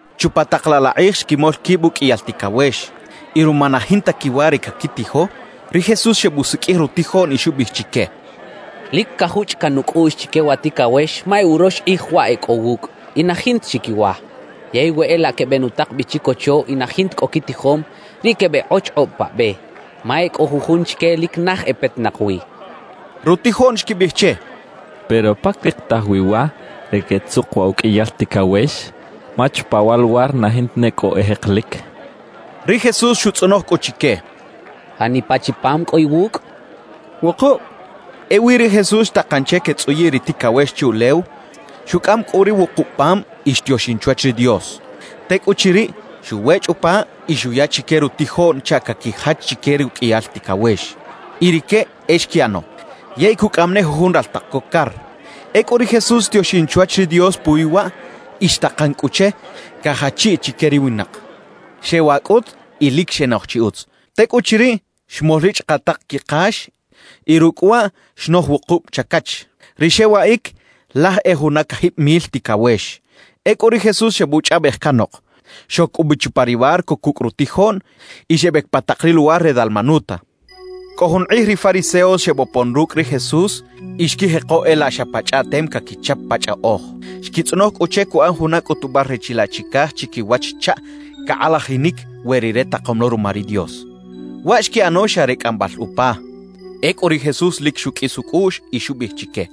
Chupa tak laꞌ la kꞌij xquimol quib uqꞌuiyal ticawex. Y ruma na jinta quiwa re caquitijo, ri Jesús xebusiqꞌuij rutijoꞌn y xubiꞌij chique: —Lic cajuchꞌ caꞌn nucꞌuꞌx chique wa ticawex ma e urox kꞌij waꞌ e cꞌo wucꞌ y na jinta chi quiwa. Yey we e laꞌ quebenutak bi chicocho y na jinta cꞌo quitijom, riꞌ quebeꞌkꞌochkꞌob pa be, ma e cꞌo jujun chique lic naj e petinak wi —xchaꞌ. Rutijoꞌn xquibiꞌij che: —Pero, ¿pa carikitaj wi wa re quetzuk wa uqꞌuiyal ticawex? Ma chupa wa luwar na jinta ne cꞌo e jekelic —xechaꞌ. Ri Jesús xutzꞌonoj cꞌu chique: —¿Janipa chi pam cꞌo iwucꞌ? —xcha chique. —Wukub —xecha rique. Ewi ri Jesús xtakan che quetzꞌuyiꞌ ri ticawex chuꞌlew. Xucꞌam cꞌu ri wukub pam y xtioxin chwach ri Dios. Tecꞌuchiriꞌ, xuwechꞌ upa y xuya chique rutijoꞌn chaꞌ caquijach chique ruqꞌuiyal ticawex; y rique e xquiꞌano. Yey cucꞌaꞌam ne jujun raltak co car. Ecꞌu ri Jesús xtioxin chwach ri Dios puwi waꞌ y xtakan cꞌu che cajachiꞌ chique ri winak. Xewaꞌ cꞌut y lic xenoj chi utz. Tecꞌuchiriꞌ, xmol ri chꞌakaꞌtaꞌk quikax y rucꞌ waꞌ xnoj wukub chacach. Ri xewaꞌic, laj e juna cajib mil ticawex. Ecꞌu ri Jesús xebuchꞌaꞌbej canok, xoc cꞌu bi chupa ri barco cucꞌ rutijoꞌn y xebec pa tak ri luwar re Dalmanuta. Cꞌo jun kꞌij ri fariseos xebopon rucꞌ ri Jesús y xquijeko e laꞌ xa pa chꞌaꞌtem caquichap pa chꞌaꞌoj. Xquitzꞌonoj cꞌu che cuꞌan juna cꞌutubal re chilaꞌ chicaj chiquiwach chaꞌ cakꞌalajinic we Rire takom lo ruma ri Dios; waꞌ xquiꞌano xa re cꞌambal upa. Ecꞌu ri Jesús lic xuqꞌuis ucꞌuꞌx y xubiꞌij chique: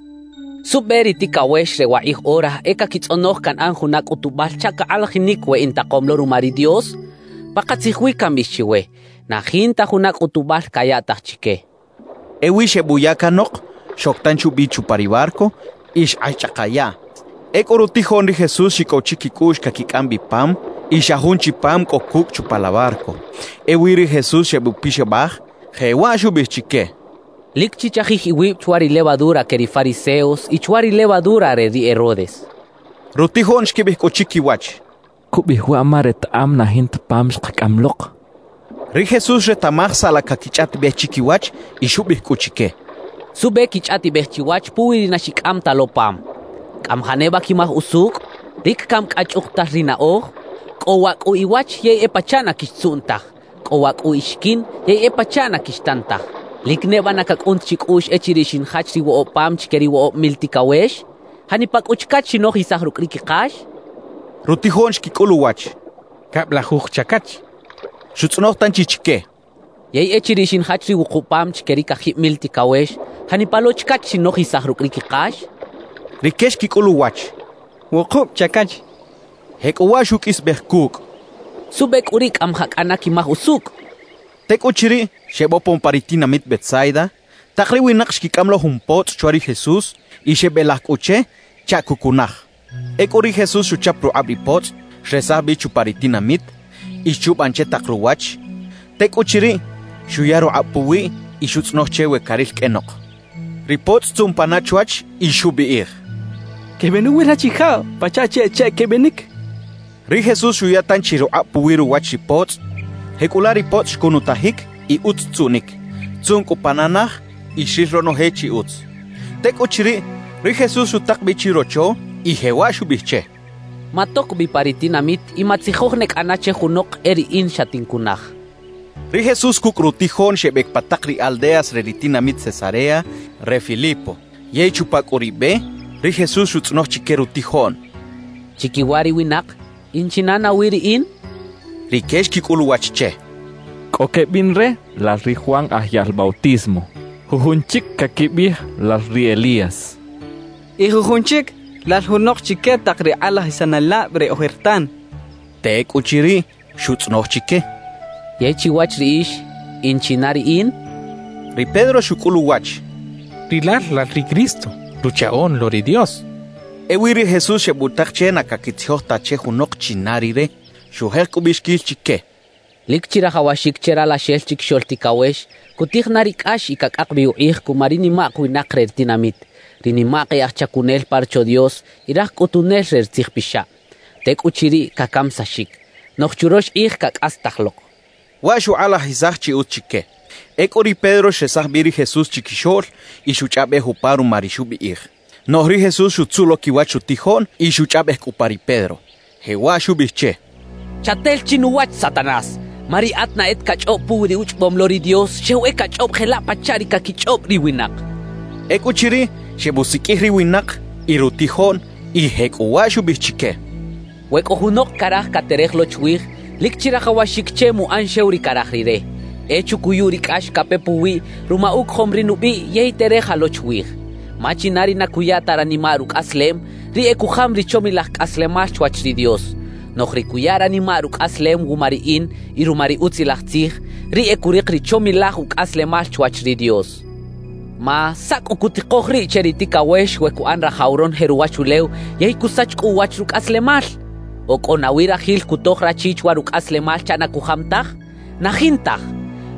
«¿Suꞌbe ri ticawex re wakꞌij ora e caquitzꞌonoj canꞌan juna cꞌutubal chaꞌ cakꞌalajinic we intakom lo ruma ri Dios? Pakatzij wi cambiꞌij chiwe: Na jinta juna cꞌutubal cayaꞌtaj chique» xchaꞌ. Ewi xebuya canok, xoc tanchi ubi chupa ri barco y xkꞌax chꞌaka yaꞌ. Ecꞌu rutijoꞌn ri Jesús xicꞌow chiquicꞌuꞌx caquicꞌam bi pam y xa jun chi pam cꞌo cucꞌ chupa la barco. Ewi ri Jesús xebupixabaj, jewaꞌ xubiꞌij chique: «Lic chichajij iwib chwa ri “levadura” que ri fariseos y chwa ri “levadura” re ri Herodes» xchaꞌ. Rutijoꞌn xquibiꞌij cꞌu chiquiwach: «Cubiꞌij waꞌ ma retaꞌam na jinta pam xkacꞌam lok» xechaꞌ. Ri Jesús xretaꞌmaj saꞌ la caquichꞌaꞌtibej chiquiwach y xubiꞌij cꞌu chique: —¿Suꞌbe quichꞌaꞌtibej chiwach puwi ri na xicꞌam ta lo pam? ¿Cꞌamajaꞌ neba quimaj usucꞌ? ¿Lic cami cꞌa chꞌukutal rinaꞌoj? Cꞌo waꞌ cꞌu iwach yey e pachaꞌ na quixtzuꞌn taj. Cꞌo waꞌ cꞌu ixiquin yey e pachaꞌ na quixtan taj. ¿Lic neba na cacꞌun ta chicꞌuꞌx echiriꞌ xinjach ri woꞌob pam chique ri woꞌob mil ticawex? ¿Janipa cꞌu chacach xinojisaj rucꞌ ri quikax? —xchaꞌ. Rutijoꞌn xquicꞌul uwach: —Cablajuj chacach —xechaꞌ. Xutzꞌonoj tanchi chique: —Yey echiriꞌ xinjach ri wukub pam chique ri cajib mil ticawex, ¿janipa lo chacach xinojisaj rucꞌ ri quikax? —xchaꞌ. Rique xquicꞌul uwach: —Wukub chacach —xechaꞌ. Jecꞌuwaꞌ xuqꞌuisbej cucꞌ: —¿Suꞌbe cꞌu riꞌ cꞌamajaꞌ cꞌana quimaj usucꞌ? —xcha chique. Tecꞌuchiriꞌ, xebopon pa ri tinamit Betsaida. Tak ri winak xquicꞌam lo jun potzꞌ chwa ri Jesús y xebelaj cꞌu che chaꞌ cucunaj. Ecꞌu ri Jesús xuchap rukꞌab ri potzꞌ, xresaj bi chupa ri tinamit y xchuban che tak ruwach. Tecꞌuchiriꞌ, xuya rukꞌab puwiꞌ y xutzꞌonoj che we caril qꞌuenok. Ri potzꞌ xtzuꞌn pana chwach y xubiꞌij: —Quebenuwil rachijab pachaꞌ chi e cheꞌ quebinic —xchaꞌ. Ri Jesús xuya tanchi rukꞌab puwi ruwach ri potzꞌ. Jecꞌulaꞌ ri potzꞌ xcunutajic y utz xtzuꞌnic. Xtzuꞌn cꞌu pana naj y xril ronoje chi utz. Tecꞌuchiriꞌ ri Jesús xutak bi chirocho y jewaꞌ xubiꞌij che: —Matoc bi pa ri tinamit y matzijoj ne cꞌana che junok e riꞌin xatincunaj —xcha che. Ri Jesús cucꞌ rutijoꞌn xebec pa tak ri aldeas re ri tinamit Cesarea re Filipo. Yey chupa cꞌu ri be, ri Jesús xutzꞌonoj chique rutijoꞌn: —Chiquiwa ri winak, ¿in china nawi riꞌin? —xchaꞌ. Rique xquicꞌul uwach che: —Cꞌo quebiꞌn re, lal ri Juan Aj Yaꞌl Bautismo; jujun chic caquibiꞌij lal ri Elías; y jujun chic, lal junok chique tak ri kꞌalajisanelab re ojertan —xechaꞌ. Tecꞌuchiriꞌ, xutzꞌonoj chique: —Yey chiwach riꞌix, ¿in china riꞌin? —xchaꞌ. Ri Pedro xucꞌul uwach: —Rilal lal ri Cristo, Ruchaꞌoꞌn lo ri Dios —xchaꞌ. Ewi ri Jesús xebutak che na caquitzijoj ta che junok china Rire. Xujek cꞌu ubiꞌxiquil chique: «Lic chirajawaxic che Ralaxel Chiquixoꞌl Ticawex cutij na ri cꞌax y cacꞌak bi ukꞌij cuma ri nimak winak re ri tinamit, ri nimak e aj chacunel pa Rocho Dios y raj cꞌutunel re ri tzijpixab. Tecꞌuchiriꞌ, cacamisaxic; noꞌj churox kꞌij cacꞌastaj lok» xchaꞌ. Waꞌ xukꞌalajisaj chi utz chique. Ecꞌu ri Pedro xresaj bi ri Jesús chiquixoꞌl y xuchꞌaꞌbej upa ruma ri xubiꞌij. Noꞌj ri Jesús xutzuꞌ lo quiwach rutijoꞌn y xuchꞌaꞌbej cꞌu upa ri Pedro, jewaꞌ xubiꞌij che: —¡Chatel chinuwach, Satanás! Ma riꞌat na e ta cachꞌob puwi ri uchꞌobom lo ri Dios, xew e cachꞌob jelaꞌ pachaꞌ ri caquichꞌob ri winak —xcha che. Ecꞌuchiriꞌ, xebusiqꞌuij ri winak y rutijoꞌn, y jecꞌuwaꞌ xubiꞌij chique: «We cꞌo junok caraj caterej lo chwij, lic chirajawaxic che muꞌan xew ri caraj rire, e chucuyu ri cꞌax cape puwiꞌ ruma ucojom ri nubiꞌ yey tereja lo chwij. Ma china ri na cuya ta ranimaꞌ rucꞌaslem, riꞌ e cujam ri chomilaj cꞌaslemal chwach ri Dios; noꞌj ri cuya ranimaꞌ rucꞌaslem wuma riꞌin y ruma ri Utzilaj Tzij, riꞌ e curik ri chomilaj ucꞌaslemal chwach ri Dios. Ma ¿saꞌ cꞌu cutikoj riꞌ che ri ticawex we cuꞌan rajaw ronoje ruwachulew yey cusach cꞌu uwach rucꞌaslemal? ¿O cꞌo nawi rajil cutoj rachi chwa rucꞌaslemal chaꞌ na cujam taj? ¡Na jintaj!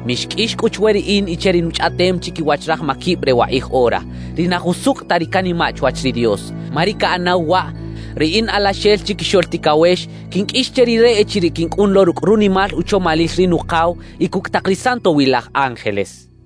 »Mixqꞌuix cꞌu chwe riꞌin y che ri nuchꞌaꞌtem chiquiwach raj maquib re wakꞌij ora, ri na jusucꞌ ta ri canimaꞌ chwach ri Dios. Ma ri caꞌanaw waꞌ, ri in Alaxel Chiquixoꞌl Ticawex quinqꞌuix che rire echiriꞌ quincꞌun lo rucꞌ runimal uchomalil ri Nukaw y cucꞌ tak ri santowilaj ángeles» xchaꞌ.